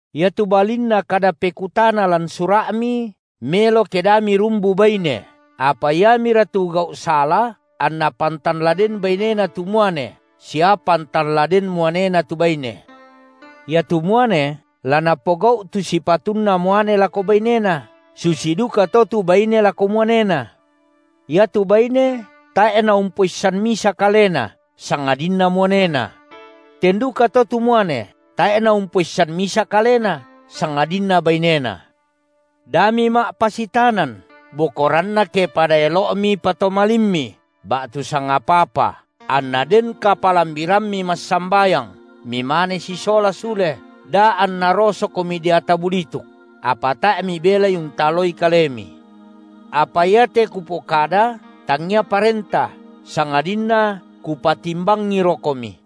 Iatu balinna kada pekutana lan sura’mi, melo ke da mirumbu baine, apa iamira tu gau’ sala, anna pantan la den bainena tu muane sia pantan la den muanena tu baine. Iatu muane la napogau’ tu sipatunna muane lako bainena, susi dukato tu baine lako muanena. Iatu baine tae’ naumpoissan misa kalena, sangadinna muanena. Ten dukato tu muane, tae’ naumpoissan misa kalena, sangadinna bainena. Da mima’pasitanan, bokoranna ke pada elo’mi patomalimmi ba’tu sangapa-apa, anna den kapalambirammi massambayang, mimane sisola sule, da anna rosokomi deata bulituk, apa tae’ mibelai untaloi kalemi. Apa iate kupokada tangia parenta, sangadinna kupatimbangirokomi.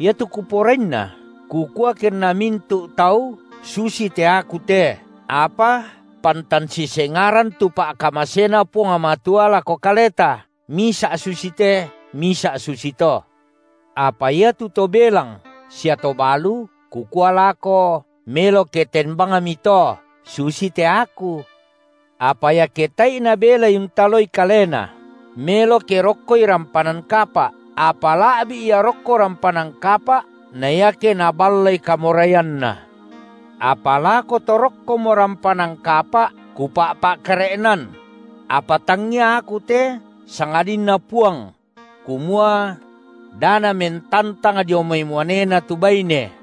Iatu kuporainna, kukua kenna mintu’ tau susite aku te, apa pantan sisengaran tu pa’kamasena Puang Matua lako kaleta, misa’ susite, misa’ susito. Apa iatu to belang sia to balu kukua lako, melo ke ten bangmito, susite aku. Apa iake tae’i nabelai untaloi kalena, melo ke rokkoi rampanan kapa’, apa la’bi’ ia rokko rampanan kapa’ na iake naballai kamoraianna. Apa lako to rokkomo rampanan kapa’ kupakare’na – apa tangia aku te sangadinNa Puang – kumua: da namentantang dio mai muanena tu baine.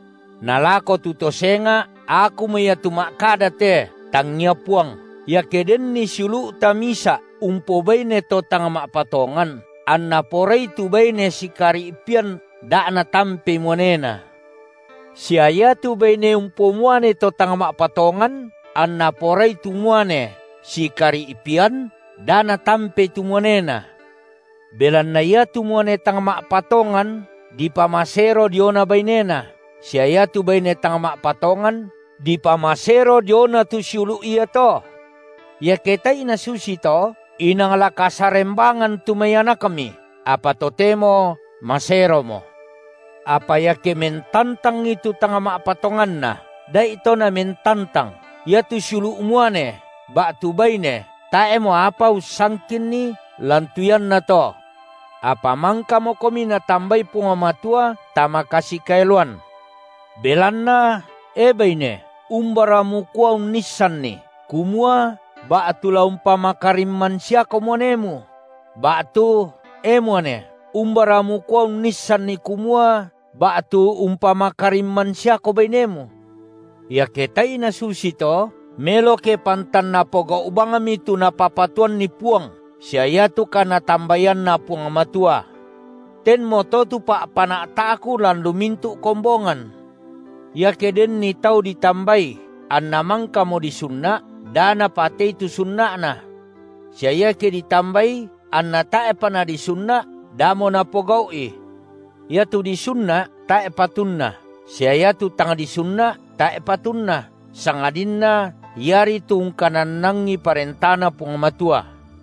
Na lako tu to senga’ akumo ia tu ma’kada te, tangia Puang: iake denni siulu’ta misa’ umpobaine to tang ma’patongan, anna porai tu baine sikari’pian da natampei muanena. Sia iatu baine umpomuane to tang ma’patongan, anna porai tu muane sikari’pian, da natampei tu muanena. Belanna iatu muane tang ma’patongan dipamasero diona bainena, sia iatu baine tang ma’patongan dipamasero diona tu siulu’ iato. Iake tae’i nasusito, inang la kasarembangan tu mai anakmi, apa totemo maseromo. Apa iake mentantangi tu tang ma’patonganna, da’ito namentantang. Iatu siulu’ muane ba’tu baine tae’mo apa ussangkinni lan tu iannato. Apa mangkamokomi Natambai Puang Matua tama kasikaeloan. Belanna, e baine, umbara mukua unnisanni kumua ba’tu la umpamakarimman siako muanemu? ba’tu, e muane, umbara mukua unnisanni kumua ba’tu umpamakarimman siako bainemu? Iake tae’ nasusito, melo ke pantan napogau’ bangmi tu napapatuanni Puang, sia iatu kanatambaianna Puang Matua. Tenmoto tu pa’pana’ta’ku lan lu mintu’ kombongan. Iake denni tau ditambai anna mangkamo disunna’, da napatae’i tu sunna’na. Sia iake ditambai anna tae’pa nadisunna’, damo napogau’i. Iatu disunna’ tae’ patunna, sia iatu tang disunna’ tae’ patunna, sangadinna iari tu ungkanannangi parentaNa Puang Matua.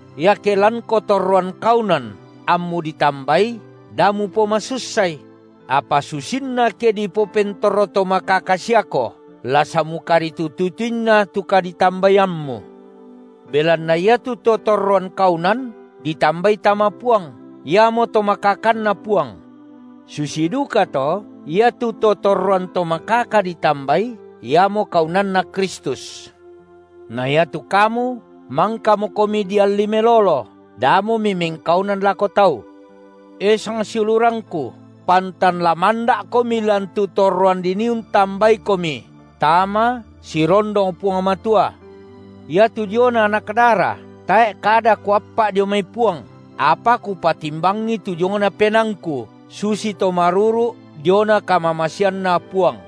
Iake lanko torroan kaunan ammu ditambai, da mupomasussai; apa susinna ke dipopentomakaka siako, la samukaritutu-tutuinna tu kaditambaiammu. Belanna iatu to torroan kaunan ditambai tama Puang, iamoto makakanNa Puang. Susi dukato iatu to torroan to makaka ditambai, iamo kaunanNa Kristus. Na iatu kamu mangkamokomi dialli melolo; damo mimengkaunan lako tau. E sangsiulurangku, pantan la manda’komi lan tu torroan dinii untambaikomi tama sirondong Puang Matua. Iatu diona anak dara, tae’ kada kuappa’ dio mai Puang, apa kupatimbangi tu diongna penaangku susito maruru’ diona kamamaseanNa Puang.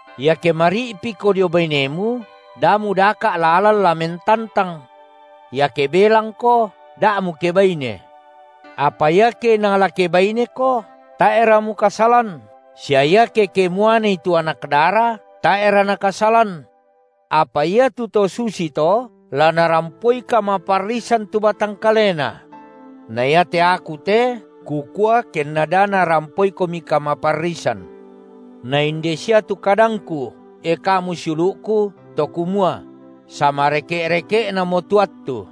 Iake mari’piko dio bainemu, da mudaka’ lalan la mentantang. Iake belangko, da mukebaine. Apa iake inang la kebaineko, tae’ra mukasalan, sia iake kemuanei tu anak dara, tae’ra nakasalan. Apa iatu to susito la narampoi kamaparrisan tu batang kalena. Na iate aku te kukua kenna da narampoikomi kamaparrisan. Nainde sia tu kadangku, e kamu siulu’ku, to kumua: samareke’-reke’namo tu attu.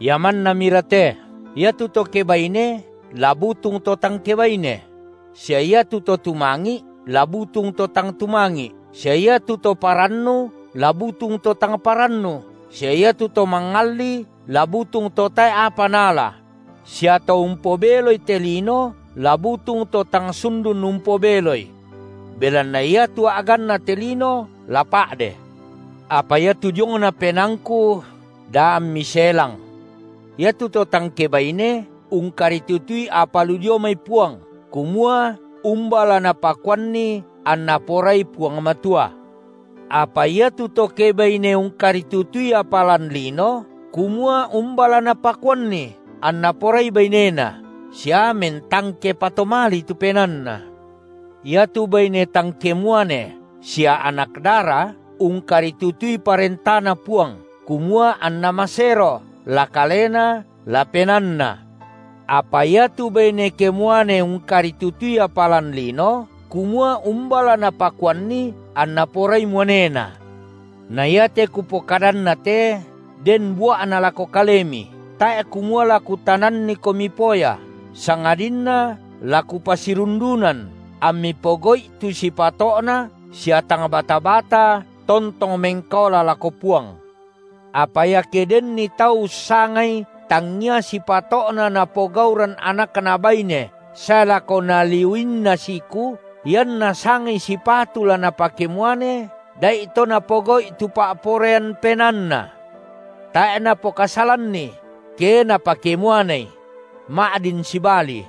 Ia mannamira te: iatu to kebaine la butung to tang kebaine; sia iatu to tumangi’ la butung to tang tumangi’, sia iatu to parannu la butung to tang parannu, sia iatu to mangalli la butung to tae’ apa naala; sia to umpobeloi te lino la butung to tang sundun umpobeloi. Belanna iatu a’ganna te lino la pa’de. Apa iatu diongna penaangku da ammi selang. Iatu to tang kebaine ungkaritutui apa lu dio mai Puang, kumua umba la napakuanni anNa porai Puang Matua. Apa iatu to kebaine ungkaritutui apa lan lino, kumua umba la napakuanni anna porai bainena, sia mentangke patomali tu penaanna. Iatu baine tang kemuane sia anak dara ungkaritutui ParentaNa Puang kumua anna masero, la kalena la penaanna. Apa iatu baine kemuane ungkaritutui apa lan lino, kumua umba la napakuanni anna porai muanena. Na iate kupokadanna te den bua’na lako kalemi, tae’ kumua la kutanannikomi poya, sangadinna la kupasirundunan ammi pogau’i tu sipato’na sia tang bata-bata tontong mengkaola lako Puang. Apa iake denni tau ussangai tangia sipato’na napogauran anakna baine sae lako naliuinna siku, ianna sangai sipatu la napakemuane, da’ito napogau’i tu pa’poraian penaanna. Tae’ napokasalanni, ke napakemuanei; ma’din sibali.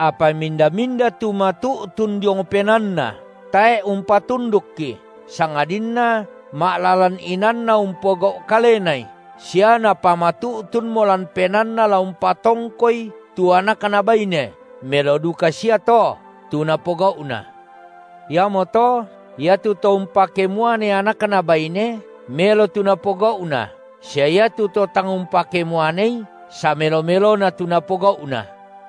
Apa minda-minda tu matu’tun diong penaanna, tae’ umpatundukki sangadinna ma’lalan inaanna umpogau’ kalenai, sia napamatu’tunmo lan penaanna la umpatongkoi tu anakna baine, melo duka sia to tu napogau’na. Iamoto iatu to umpakemuane anakna baine, melo tu napogau’na sia iatu to tang umpakemuanei samelo-melona tu napogau’na.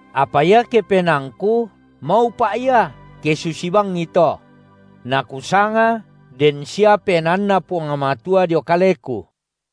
Apa iake penaangku, maupa’ ia, ke susi bangi to. Na kusanga den sia PenaanNa Puang Matua dio kaleku.